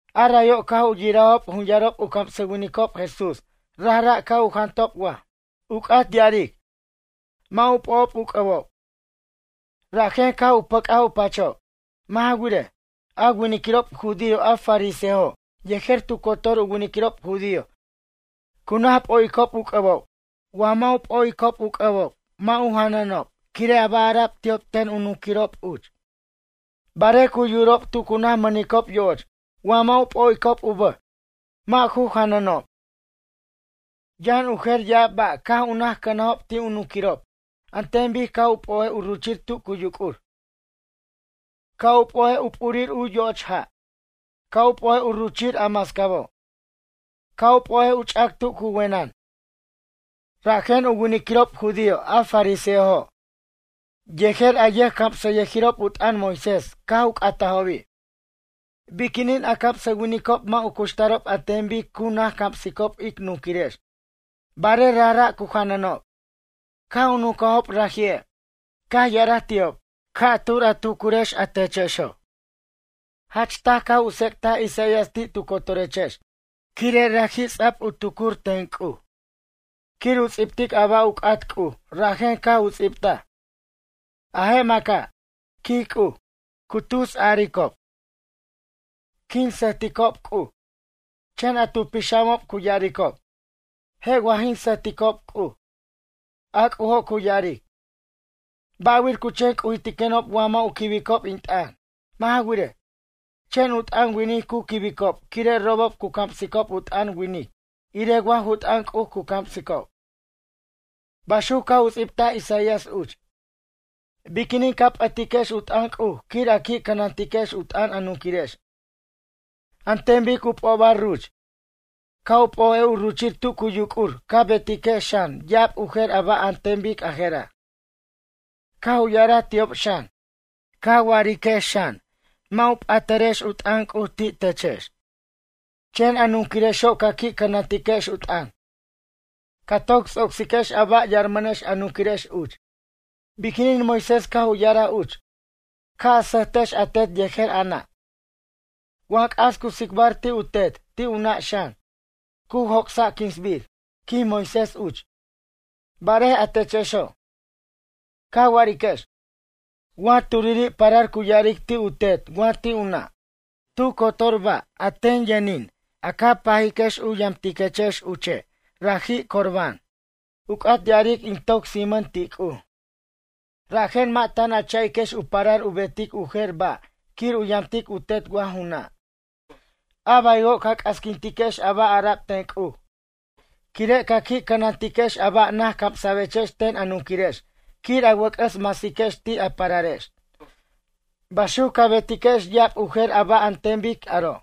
A rayo' caj u yirajob jun yarob u camsʌwinicob Jesús rajra' caj u jantob waj, u c'at ya'aric, mʌ' u p'o'ob u c'ʌbob, rajen caj u pʌc'aj u pachob. Mʌ' ja wirej, a winiquirob judío a fariseojo' yejer tu cotor u winiquirob judío cu naj p'o'icob u c'ʌbob wa mʌ' u p'o'icob u c'ʌbob mʌ' u janʌnob quire' a ba' ara'b ti'ob ten u nunquirob uch. Barej cu yurob tu cu naj mʌnicob yo'och wa mʌ' u p'o'icob u bʌj mʌ' ju janʌnob. Yʌn u jer ya'ab ba' caj u naj cʌnajob ti' u nunquirob an ten bic ca' u p'o'ej u ruchir tu cu yuc'ur. Ca' u p'o'ej u p'urir u yo'och ja'. Ca' u p'o'ej u ruchir a mascabo'. Ca' u p'o'ej u ch'ac tu cu wenʌn. Rajen u winiquirob judío a fariseojo' yejer a yʌjcamsʌyʌjirob u t'ʌn Moisés caj u c'atajobi': ―Biquinin a camsʌwinicob mʌ' u cuxtarob an ten bic cu naj camsicob ic nunquirex barej rajra' cu janʌnob? Caj u nuncajob raji'e', caj ya'araj ti'ob: ―Ca'tur a tucurechex a techexo'. Jach taj caj u tsec'taj Isaías ti' tu cotorechex quire' raji' ts'a'b u tucuric ten C'uj quir u ts'ibtic a ba' u c'at C'uj rajen caj u ts'ibtaj: A je' maca', quij C'uj, cu tusaricob: “Quin sʌjticob C'uj”, chen a tu pixamob cu ya'aricob: “Je' wa jin sʌjticob C'uj.” A C'ujo' cu ya'aric: “Ba' wir cu chen c'ujintiquenob wa mʌ' u quibicob in t'ʌn? Mʌ' ja wirej, chen u t'ʌn winic cu quibicob quire' robob cu camsicob u t'ʌn winic irej wa ju t'ʌn C'uj cu camsicob.” Baxuc caj u ts'ibtaj Isaías uch. Biquinin ca p'ʌtiquex u t'ʌn C'uj quir a qui' cʌnantiquex u t'ʌn a nunquirirex an ten bic u p'obar ruch. Ca' u p'o'ej u ruchir tu cu yuc'ur ca betiquex xan ya'ab u jer ba' an ten bic a jera'. Caj u ya'araj ti'ob xan: ―Ca wa'ariquex xan, mʌ' patarex u t'ʌn C'uj ti' techex, chen a nunquirexo' ca qui' cʌnantiquex u t'ʌn. Ca toc ts'ocsiquex a ba' yarmʌnex a nunquirex uch. Biquinin Moisés caj u ya'araj uch: “Ca' a sʌjtex a tet yejer a nʌ'. Wa c'as cu tsicbar ti' u tet, ti' u nʌ' xan, cu joc'sa' quinsbir”, quij Moisés uch. Barej a techexo', ca wa'ariquex: Wa turiri' parar cu ya'aric ti' u tet wa ti' u nʌ': “Tu cotor ba' a ten yʌnin a ca pajiquex u yamtiquechex uche' raji' Corbán”, u c'at ya'aric in toc sijmʌn ti' C'uj; rajen mʌ' tan a cha'iquex u parar u betic u jer ba' quir u yamtic u tet wa ju nʌ'. A baywo' ca c'asquintiquex a ba' ara'b ten C'uj quire' ca qui' cʌnantiquex a ba' naj camsa'bechex ten a nunquirex quir a wʌc'ʌs masiquex ti' a pararex. Baxuc ca betiquex ya'ab u jer a ba' an ten bic aro'.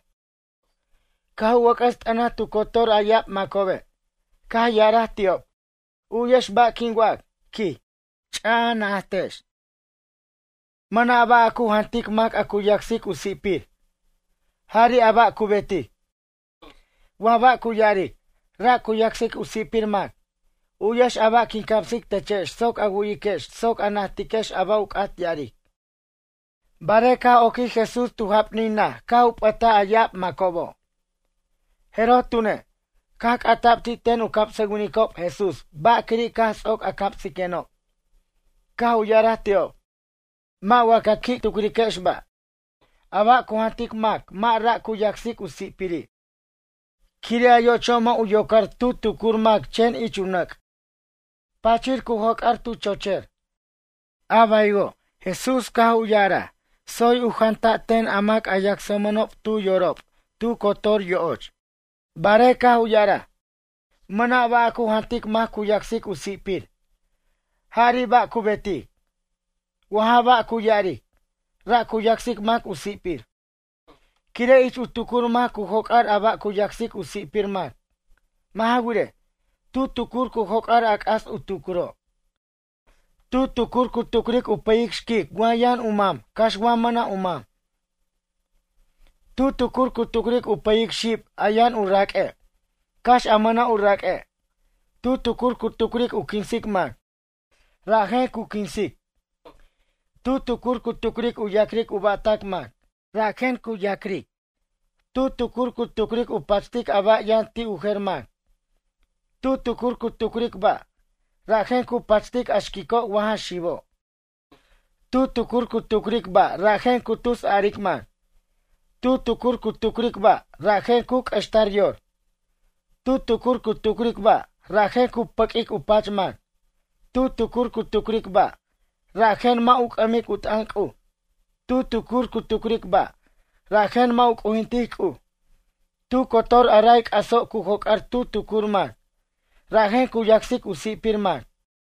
Caj u wʌc'ʌs t'ʌnaj tu cotor a ya'ab macobe', caj ya'araj ti'ob: ―U'yex ba' quin wac ―quij―, ch'aj a najtex. Mʌna' ba' a cu jantic mac a cu yasic u si'pir, jari' a ba' cu betic, wa ba' cu ya'aric, ra' cu yacsic u si'pir mac. U'yex a ba' quin camsic techex soc a wu'yiquex soc a najtiquex a ba' u c'at ya'aric. Barej caj oquij Jesús tu japnin naj caj u p'ʌtaj a ya'ab macobo', jeroj tune', caj c'ata'b ti' ten u camsʌwinicob Jesús ba' quiri' caj ts'oc a camsiquenob. Caj u ya'araj ti'ob: ―Mʌ' wa qui' ca tucriquex ba'? A ba' cu jantic mac mʌ' ra' cu yacsic u si'piri'. Quire' a yo'ocho' mʌ' u yocar tu tucur mac chen ich u nʌc', pachir cu joc'ar tu chocher. A baywo' Jesús caj u ya'araj tsoy u janta' ten a mac a yacsmʌnob tu yorob tu cotor yo'och. Barej caj u ya'araj: ―Mʌna' ba' a cu jantic mac cu yacsic u si'pir, jari' a ba cu betic, wa ja ba' cu ya'aric, ra' cu yasic mac u si'pir. Quire' ich u tucur mac cu joc'ar a ba' cu yacsic u si'pir mac. Mʌ' ja wirej, tu tucur cu joc'ar a c'as u tucuro', tu tucur cu tucric u pʌyic xquic wa yʌn u mam cax wa mʌna' u mam. Tu tucur cu tucric u pʌyic xib a yʌn u raq'ue', cax a mʌna' u raq'ue'. Tu tucur cu tucric u quinsic mac, rajen cu quisic. Tu tucur cu tucric u ya'cric u ba'tac mac, rajen cu ya'cric. Tu tucur cu tucric u pachtic a ba' yʌn ti' u jer mac. Tu tucur cu tucric ba', rajen cu pachtic a xquico' wa ja xibo'. Tu tucur cu tucric ba' rajen cu tus aric mac. Tu tucur cu tucric ba', rajen cu q'uextar yor. Tu tucur cu tucric ba', rajen cu pʌq'uic u pach mac. Tu tucur cu tucric ba', rajen mʌ' u c'ʌmic u t'ʌn C'uj. Tu tucur cu tucric ba', rajen mʌ' u c'ujintic C'uj. Tu cotor a ray c'aso' cu joc'ar tu tucur mac, rajen cu yacsic u si'pir mac.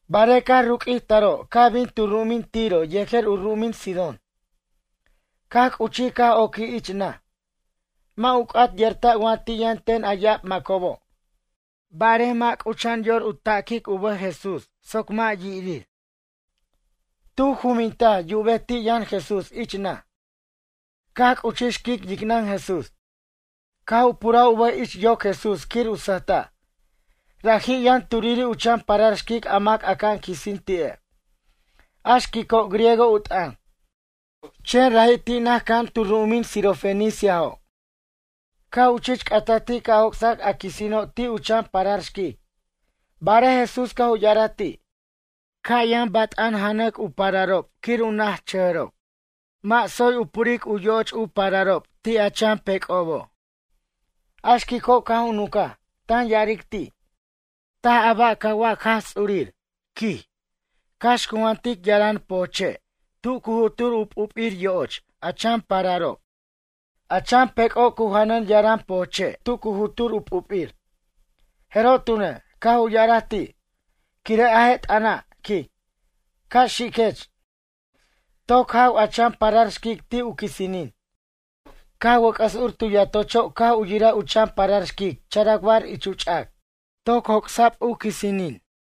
Barej caj ruq'uij taro' caj bin tu ru'umin Tiro yejer u ru'umin Sidón. Caj c'uchij caj oquij ich naj. Mʌ' u c'at yerta' wa ti' yʌn ten a ya'ab macobo', barej mʌ' c'ucha'an yor u taquic u bʌj Jesús soc mʌ' yirir. Tu juminta' yubej ti' yʌn Jesús ich naj, caj c'uchij xquic yicnʌn Jesús, caj u puraj u bʌj ich u yoc Jesús quir u sʌjta'. Raji' yʌn turiri' u chan parar xquic a mac aca'an quisin ti'e'. A xquico' griego u t'ʌn, chen raji' ti' naj cʌja'an tu ru'umin sirofeniciajo'. Caj u chich c'ataj ti' ca' joc'sac a quisino' ti' u chan parar xquic. Barej Jesús caj u ya'araj ti': ―Ca' yʌn bat'an janac u pararob quir u nachajʌrob. Mʌ' tsoy u puric u yo'och u pararob ti' a chan pec'obo'. A xquico' caj u nuncaj, tan ya'aric ti': ―Taj a ba' ca wac Jaj Ts'urir ―quij―, cax cu jantic yaran pojche' tu cu jutur u p'up'ir yo'och a chan pararob. A chan pec'o' cu janʌn yaram pojche' tu cu jutur u p'up'ir. Jeroj tune', caj u ya'araj ti': ―Quire' a je' t'ʌna' ―quij―, ca' xiquech, toc jaw a chan parar xquic ti' u quisinin. Caj wʌc'ʌs ur tu yatocho' caj u yiraj u chan parar xquic characbar ich u ch'ac, toc joc'sa'b u quisinin.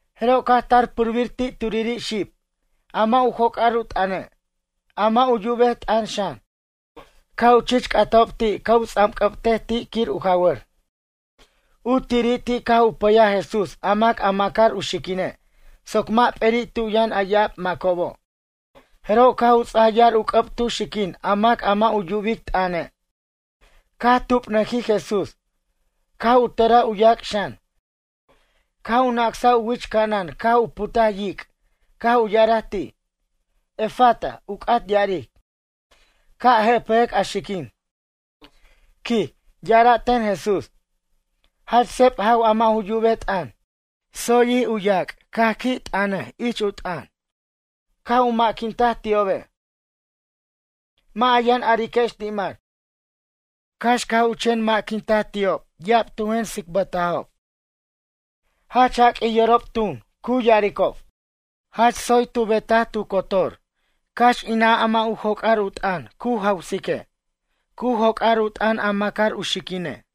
Jeroj caj tar purbir ti' turiri' xib, a mʌ' u joc'ar u t'ʌne', a mʌ' u yubej t'ʌn xan. Caj u chich c'atajob ti' ca' u ts'anc'ʌbtej ti' quir u jawʌr. U tiri' ti' caj u pʌyaj Jesús a mac a macar u xiquine' soc mʌ' p'eri' tu yʌn a ya'ab macobob. Jeroj caj u ts'aj yar u c'ʌb tu xiquin a mac a mʌ' u yubic t'ʌne', caj tubnʌjij Jesús, caj u tʌraj u yac' xan. Caj u nacsaj u wich ca'anan caj u putaj yic', caj u ya'araj ti': ―Efata, u c'at ya'aric: Ca' jepʌjʌc a xiquin ―quij ya'ara' ten Jesús. Jach seb jaw a mʌ' u yubej t'ʌn. Tsoyjij u yac' caj qui' t'ʌnʌj ich u t'ʌn. Caj u maquintaj ti'obe': ―Mʌ' a yʌn ariquex ti' mac. Cax caj u chen maquintaj ti'ob ya'ab tu jen tsicbʌtajob. Jach jaq'uij yorob tun, cu ya'aricob: ―Jach tsoy tu beta'r tu cotor, cax inan a mʌ' u joc'ar u t'ʌn cu jawsique', cu joc'ar u t'ʌn a macar u xiquine'.